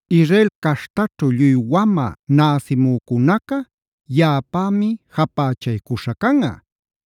“Israel caśhtaćhu lluy wamä näsimücunaca yaꞌapämi japächaycuśha canꞌa,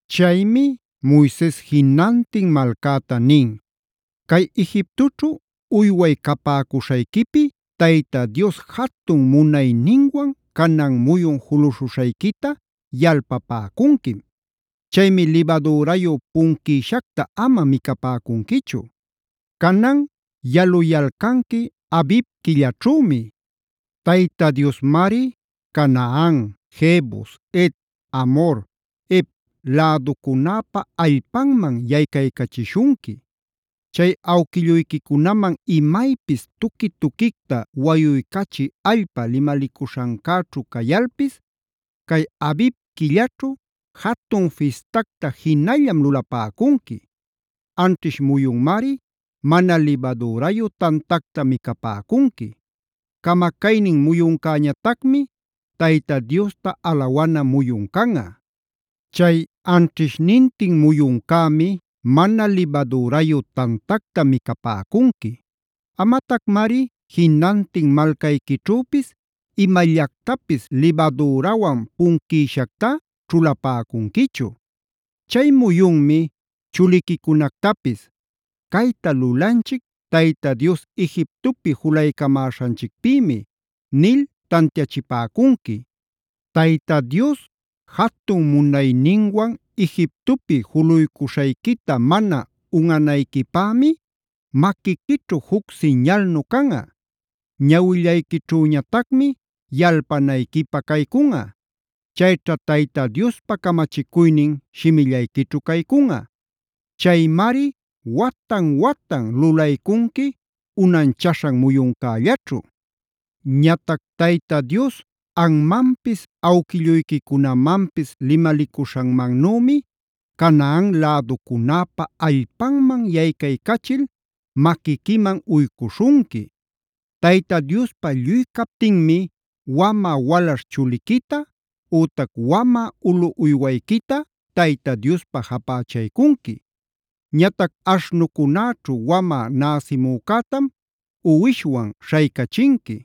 Chaymi Moises jinantin malcäta nin: “Cay Egiptoćhu uyway capäcuśhayquipi Tayta Dios jatun munayninwan canan muyun juluśhuśhayquita yalpapäcunquim. Chaymi libadürayu punquïshacta ama micapäcunquichu. Canan yaluyalcanqui Abib quillaćhümi. Tayta Diosmari Canaan, Jebus, Het, Amhor, Hev läducunäpa allpanman yaycachishunqui. Chay awquilluyquicunaman imaypis tuqui-tuquicta wayuycachï allpa limalicuśhancäćhu cayalpis, cay Abib quilläćhu jatun fistacta jinallam lulapäcunqui. Anćhish muyunmari mana libadürayu tantacta micapäcunqui. Camacaynin muyuncäñatacmi Tayta Diosta alawana muyun canꞌa. Chay anćhishnintin muyuncämi mana libadürayu tantacta micapäcunqui. Amatacmari jinantin malcayquićhüpis imallactapis libadürawan punquïshactá ćhulapäcunquichu. Chay muyunmi chuliquicunactapis: ‘Cayta lulanchic Tayta Dios Egiptopi julaycamaśhanchicpïmi’ nil tantiachipäcunqui. Tayta Dios jatun munayninwan Egiptopi juluycuśhayquita mana unꞌanayquipämi maquiquićhu juc siñalnu canꞌa; ñawillayquićhüñatacmi yalpanayquipä caycunꞌa. Chayćha Tayta Diospa camachicuynin shimillayquićhu caycunꞌa. Chaymari watan-watan lulaycunqui unanchaśhan muyuncällaćhu. “Ñatac Tayta Dios anmanpis awquilluyquicunamanpis limalicuśhanmannümi Canaan läducunäpa allpanman yaycaycachil maquiquiman uycuśhunqui. Tayta Diospa lluy captinmi wamä walaśh chuliquita ütac wamä ulu uywayquita Tayta Diospa japächaycunqui.b Ñatac aśhnucunäćhu wamä näsimücätam uwishwan śhaycachinqui.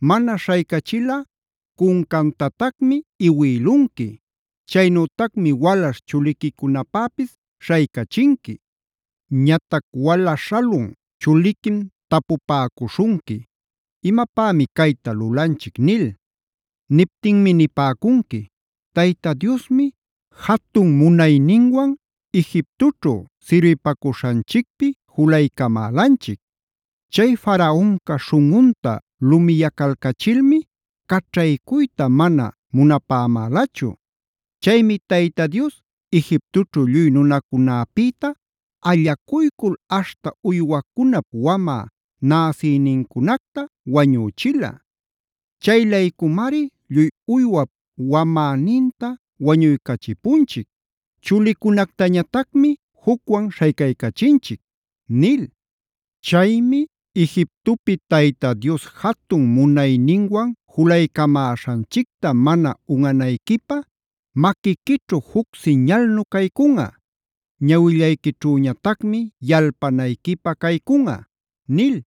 Mana śhaycachilꞌa cuncantatacmi iwïlunqui. Chaynütacmi walaśh chuliquicunapäpis śhaycachinqui. “Ñatac wala śhalun chuliquim tapupäcuśhunqui: ‘¿Imapämi cayta lulanchic?’ nil. Niptinmi nipäcunqui: ‘Tayta Diosmi jatun munayninwan Egiptoćhu sirbipacuśhanchicpi julaycamälanchic. Chay Faraonca śhunꞌunta lumiyacalcachilmi caćhaycuyta mana munapämälachu. Chaymi Tayta Dios Egiptoćhu lluy nunacunäpïta allacuycul aśhta uywacunap wamä näsïnincunacta wañüchila. Chay-laycumari lluy uywap wamäninta wañuycachipunchic; chulicunactañatacmi jucwan śhaycaycachinchic’ nil. Chaymi Egiptopi Tayta Dios jatun munayninwan julaycamäśhanchicta mana unꞌanayquipä maquiquićhu juc siñalnu caycunꞌa; ñawillayquićhüñatacmi yalpanayquipä caycunꞌa” nil.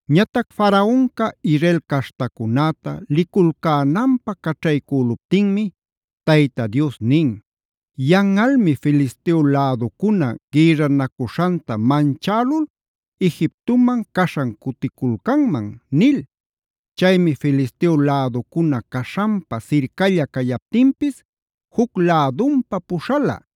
Ñatac Faraonca Israel caśhtacunäta liculcänanpä caćhaycüluptinmi, Tayta Dios nin: “Yanꞌalmi Filisteo läducuna gïrranacuśhanta manchälul Egiptoman caśhan cuticulcanman” nil. Chaymi Filisteo läducuna caśhanpa sircalla cayaptinpis juc lädunpa puśhala.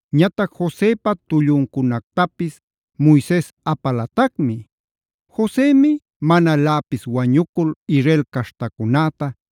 Ñatac Josepa tulluncunactapis Moises apalatacmi. Josemi manaläpis wañucul Israel caśhtacunäta: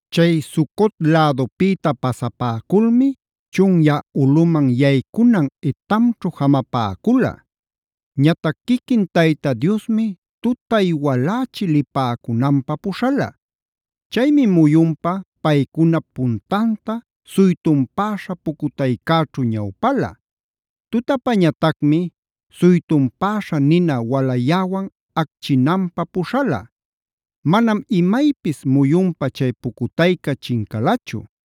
Chay Sucot lädupïta pasapäculmi chunyä ulꞌuman yaycunan Etamćhu jamapäcula. Ñatac quiquin Tayta Diosmi tutay walächi lipäcunanpä puśhala. Chaymi muyunpa paycunap puntanta suytunpäśha pucutaycäćhu ñawpala. Tutapañatacmi suytunpäśha nina waläyäwan achquinanpä puśhala. Manam imaypis muyunpa chay pucutayca chincalachu;